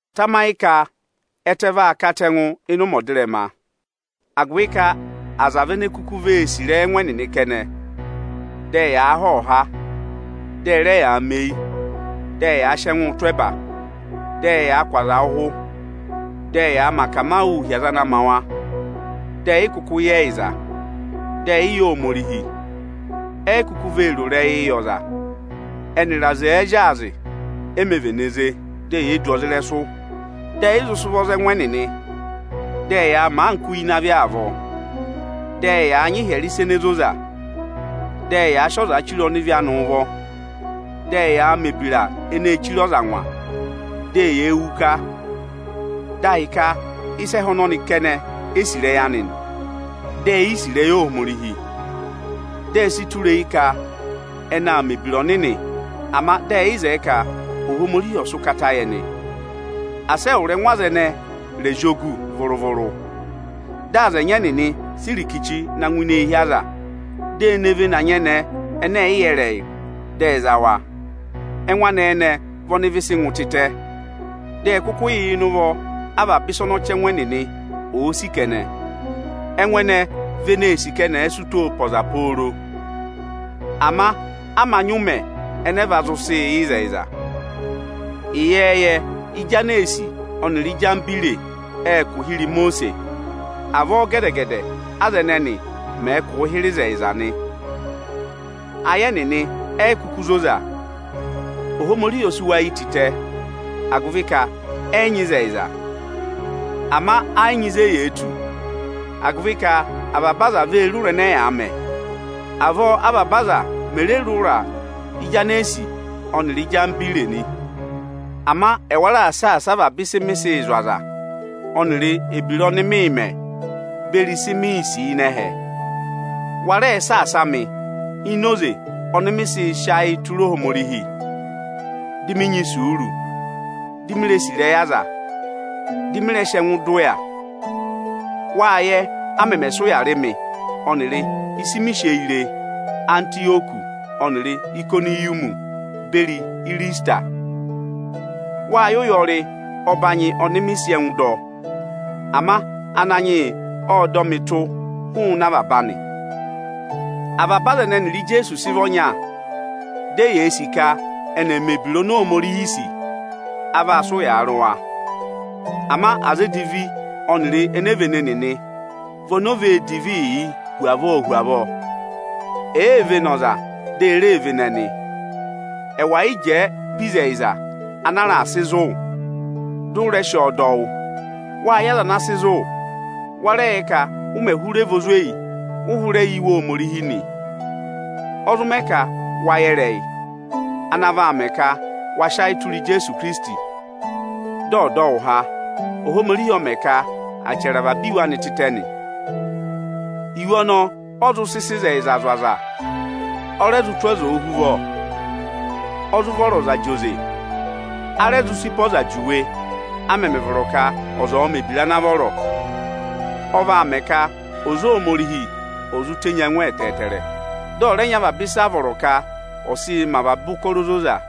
Tamayị ka ẹtẹ vaa katẹngụ ịnị ụmẹ ọdịrẹma, agụvị ka aza vị ene kuku vee sì ịrẹyị ẹngụ ẹnịnị kẹnẹ, dị ẹyaa họ́họ̀ha, dị ẹ rẹ yaa mẹ eyi, dị ẹyaa sị ẹngụụ tụ́ ẹba. Dị ẹyaa kụ́ aza ụhụ, dị ẹyaa mẹ akamawụụ hi aza ana ma wa, dị ẹyị kụkụ yẹ ẹyịza, dị ẹyị yẹ Ohomorihi. E yi kuku vee ro ịrẹyịị yị ọza; ẹnịrị aza ẹ̀ẹ zyaazị, e mē vene ze; dị eyee du ọza ịrẹsụ. Dị ẹyị zụ sị ụvọ za ẹngụ ẹnịnị, dị ẹyaa mẹ anka uye ịnị avị avọọ, dị ẹyaa nyị ịhyẹrẹ ịsa ene zoza. Dị ẹyaa sị ọzaa chire ọnịvị anị ụvọ, dị ẹyaa mẹ̀ ebira eneē chire ọza angwa, dị eyee wù ịka. Dị a hị́ ka ịsa ẹhẹ ọnọnị kẹnẹ e sì ịrẹyị anị nị, dị e yi sí ịrẹyị Ohomorihi. Dị ẹ sị tụra eyi ka ẹnị aa mẹ̀ ebira ọnịnị, ama dị ẹyị zẹẹ ka Ohomorihi ọ̀ sị ụkata yị ẹnị. Asị ẹwụrị ẹngụ aza ẹnẹẹ zị ògù vụrụ-vụrụ! Dị aza ẹnyị ẹnịnị sị irikichi na ngụ ini eehi aza, dị e ne vene anyẹnẹẹ ẹnẹ ẹ̀ yị yẹ ịrẹyị, dị ẹ za wa. Ẹngụ anẹẹ ẹnẹẹ vị ọnị ịvị sị ngụ tịtẹ, dị ẹ kụkụ yà ịnị ụvọ avaba ịsa ọnị ọchẹngụ ẹnịnị òo sì kẹnẹ. Ẹngụ anẹẹ ẹnẹẹ vị eneē sì ka ẹnị ẹ̀ẹ sị ụtọọ pe ọza pooro, ama a mā nyị ụmẹ ẹnẹ ẹ va zụ sị yẹ ịzẹyịza. Ịyẹẹyẹ, Ijanesi ọnịrị Ijambire ệ kụ̀ hịrẹ Imosiisi; avọọ gẹdẹ-gẹdẹ aza ẹnẹnị mẹ̀ẹ̄ kụ̀ụ hịrẹ ịzẹyịza nị. Ayị ẹnịnị eyi kuku zoza; Ohomorihi ọ sị wa yi tịtẹ, agụvị ka ẹyị nyị ịzẹyịza. Ama ẹ́ yị nyị ịzị eyee tù, agụvị ka avaba aza vee re ụra ẹnẹ ẹyaa mẹ. Avọọ avaba aza mè re re ụra Ijanesi ọnịrị Ijambire nị. Ama ẹwa raà saasa avaba ịsị mị sịị̄ zụ̀ aza, ọnịrị ebira ọnị mịị̄ mẹ beri ịsị miī sì ịnị ẹhẹ. Wa rẹ saasa mị ini oze ọnị mị zị sị ayị tụra Ohomorihi, dị mị nyị isuuru, di mee sì ịrẹyị aza, dị mị rẹ sị ẹngụ dọ ụya. Wâ yẹ, a mẹmẹ sị ụya rị mị ọnịrị ịsị mi sị eyi re Antịyọkị ọnịrị Ayịkọnịyọmị beri Ịrịsịtịra. Wâ yẹ ụyọrị ọbanyị ọnị mị sị ẹngụ dọ. Ama Ananyị yị ọ́ọ dọ mị tụ́ hụụnị avaba anị. Avaba aza ẹnẹ ẹnịrị Ijeesu sị vị ọnya, dị eyee sì ka ẹnị ẹ̀ẹ m ẹ ebira oni Ohomorihi sì, a vaa sị ụyaa rị wa. Ama aza edivi ọnịrị enevene nịnị vị oni o vee divi yii hu avọọ hu avọọ. E vee vene ọza, dị e re vene ẹnị. Ẹwà yị jẹẹ pe ịzẹyịza ana a raà sị zụ̀ wụ, dị ụ rẹ sị ọọ dọ wụ́! Wâ yẹ aza ana sị zụ̀ wụ. Wa rẹ yẹ ka, ụ mẹ̀ hụrẹ vị ozweyi, ụ hụrẹ yẹ Iwe Ohomorihi nị. Ọ zụ mẹ ka wa yẹ ịrẹyị, ana vaa mẹ ka wa sị ayị tụra Ijeesu Ikirisiti, dị ọ̀ dọ wụ há. Ohomorihi ọ mẹ ka à chẹrẹ avaba Iwe anị tịtẹ nị. Iwe ọnọọ ọ zụ sị sị ịzẹyịza zụ̀ aza, ọ rẹ zụ tụ́ ọza ohuvọ, ọ zụ vọrọ ọza zị oze, a rẹ zụ sị pe ọza juwe, a mẹmẹ vọrọ ka ọza ọ̀ọ mẹ̀ ebira ana vọrọ. Ọ vaa mẹ ka ọza Ohomorihi ò zụ tenyi ẹngụ ẹtẹẹtẹrẹ, dị ọ̀ rẹ nyị avaba ịsị a vọrọ ka ọ̀ sịị mẹ avaba ụkọrọ ozoza.